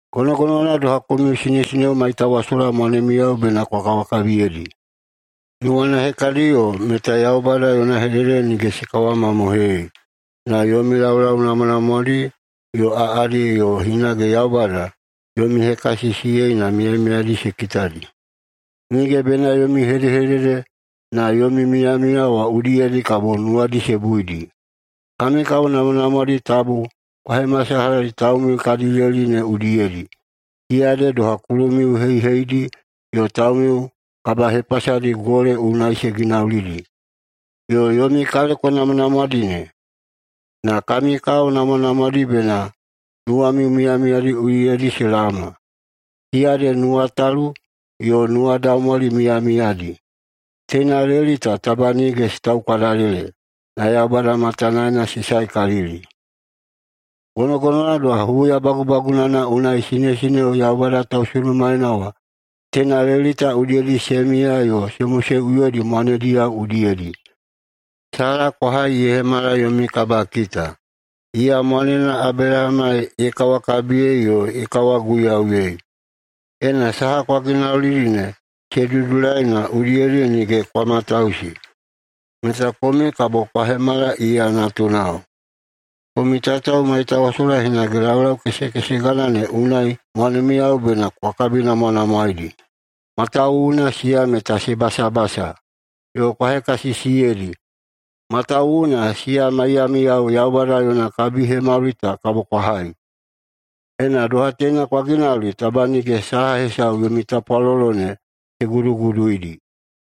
Gonogonowana doha komiu sinesineo maitawasola mwanemiyao bena kwa kawakabiyeidi. Nuwana hekadiyo meta Yaubada yona hedehedede nige se kawamamohoiyei, na yomi laulau namwanamwadi yo aꞌadi yo hinage Yaubada yomi hekasisiyeina miyamiyadi se kitadi. Nige bena yomi hedehedede, na yomi miyamiya wa udiyedi kabo nuwadi se buidi. Kami kao namwanamwadi tabu kwa hemasalahadi taumiu kadi leli ne udiyedi, siya ede doha kulumiu heiheidi yo taumiu kabahepasadi gole unai se ginaulidi, yo yomi kaleko namwanamwadi ne. Na kami kao namwanamwadi bena nuwamiu miyamiyadi udiyedi se laoma. Siya ede nuwatalu yo nuwadaumwali miyamiyadi. Teina leli ta taba nige se taukwadalele na Yaubada matanaena se saekalili. Gonogonowana doha huya bagubagunana unai sinesineo Yaubada tausunumaena wa teina leli ta udiyedi se miya yo se moseꞌuyoidi mwanediyao udiyedi. Sala kwa hai ye hemala yomi kabakita. Iya mwanena Abelahama ye kawakabiyei yo ye kawaguiyauyei. Ena saha kwa ginaulidi ne se dudulai na udiyedi nige kwa matausi, meta komiu kabo kwa hemala iya natunao. Komiu tatao maitawasola hinage, laulau kesekesegana ne unai mwanemiyao bena kwa kabinamwanamwaeidi, matawuwuna siya meta se basabasa. Yo kwa hekasisiyeidi, matawuwuna siya maiyamiyao Yaubada yona kabihemauli ta kabo kwa hai. Ena doha teina kwa ginauli, taba nige saha hesau yomi tapwalolo ne se guduguduidi.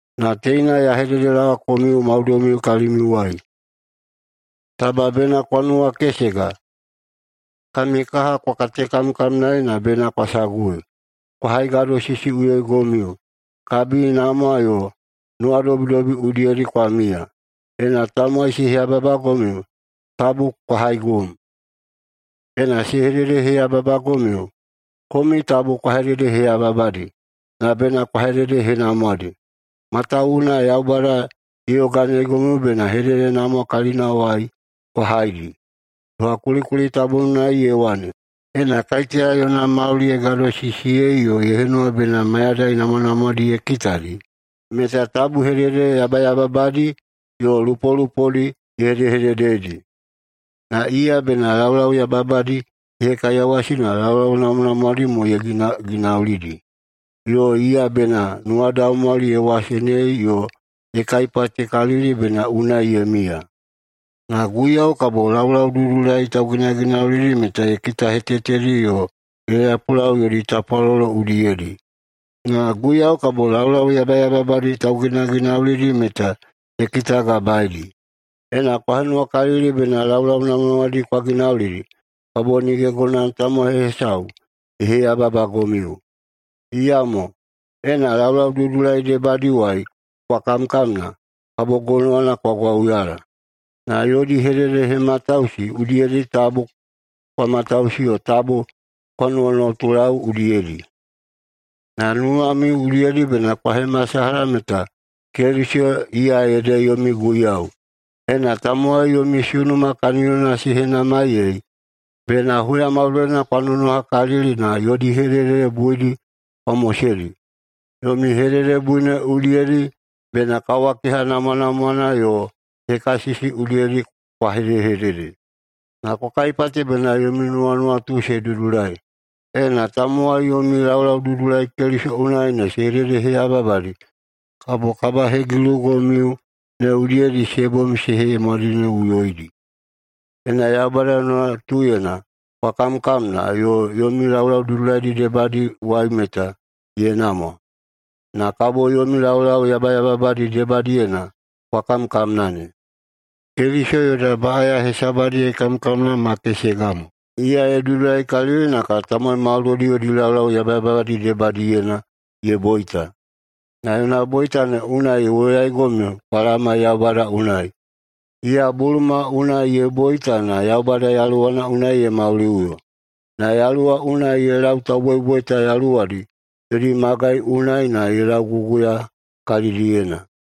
Na teina ya hededelaowa komiu maudoimiu kalimiuwai: Taba bena kwa nuwakesega, kami kaha kwa katekamkamnaei na bena kwa sagui, kwa haigadosisiꞌuyoigomiu, kabinamwa yo nuwadobidobi udiyedi kwa miya. Ena tamowai se heyababagomiu, tabu kwa haigum. Ena se hededeheyababagomiu, komiu tabu kwa hededeheyababadi, na bena kwa hededehenamwadi, matawuwuna Yaubada ye yoganeigomiu bena hededehenamwa kalinawai kwa haidi. Doha kulikuli tabuna unai ye wane, “Ena kaiteya yona mauli ye gadosisiyei yo ye henuwa bena mayadai namwanamwadi ye kitadi, meta tabu hedehedede yabayababadi yo lupolupodi ye hedehededeidi. Na iya bena laulau yabayababadi ye hekaiyawasidi na laulau namwanamwadi mo ye ginaginaulidi. Yo iya bena nuwadaumwali ye wasenei yo ye kaipatekalili bena unai ye miya. Na Guiyau kabo laulaududulai tauginaginaulidi meta ye kitahetetedi yo ye lapulau yodi tapwalolo udiyedi. Na Guiyau kabo laulau yabayababadi tauginaginaulidi meta ye kitagabaedi.” Ena kwa henuwakalili bena laulau namwanamwadi kwa ginaulidi, kabo nige gonowana tamowai hesau ye heyababagomiu. Iyamo, ena laulaududulai debadiwai kwa kamkamna, kabo gonowana kwa gwauyala. Na “yodi hededehematausi udiyedi tabu kwa matausi yo tabu kwa nuwanuwatulau udiyedi.” Na nuwamiu udiyedi bena kwa hemasalaha meta Keliso iya ede yomi Guiyau. Ena tamowai yomi sunuma kaniyona se henamaiyei, bena huya maudoina kwa nonohakalili na yodi hedehedede buidi kwa moseidi. Yomi hededebui ne udiyedi bena kawakeha namwanamwana yo hekasisi udiyedi kwa hedehedede na kwa kaipate bena yomi nuwanuwatu se dudulai. Na ena tamowai yomi laulau dudulaidi Keliso unai ne se hededeheyababadi, kabo kabahegilugomiu ne udiyedi se bom se hemwadineꞌuyoidi. Ena Yaubada yona nuwatuyena kwa kamkamna yomi laulau dudulaidi debadiwai meta ye namwa, na kabo yomi laulau yabayababadi debadiyena kwa kamkamna ne. Keliso yoda baꞌaya hesabadi ye kamkamna ma kesega mo. Iya ye dudulaikalili na tamowai maudoidi yodi laulau yabayababadi debadiyena ye boita. Na yona boita ne unai ye woyaigomiu kwa laoma Yaubada unai. Iya buluma unai ye boita na Yaubada Yaluwana unai ye mauliꞌuyo. Na Yaluwa unai ye lau tauboiboita yaluwadi yodi magai unai na ye lauguguya kalidiyena.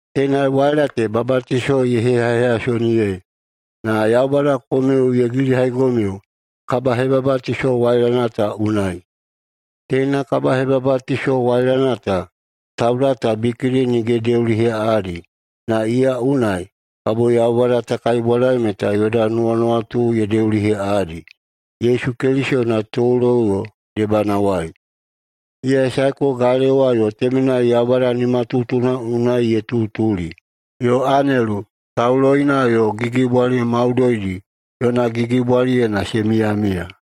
Teina waila ta babatiso ye heyaheyasoniyei. Na Yaubada komiu ye gilihaigomiu kabahebabatiso wailana ta unai. Teina kabahebabatiso wailana ta tauda ta bikidi nige ye deuliheꞌaꞌadi, na iya unai kabo Yaubada ta kaibwadai meta yoda nuwanuwatu ye deuliheꞌaꞌadi Yesu Keliso yona toloꞌuyo debanawai. Iya ye saeko galewa yo temenai Yaubada nimatutuna unai ye tutuli. Yo anelu, tauloina yo gigibwali maudoidi yona gigibwaliyena se miyamiya.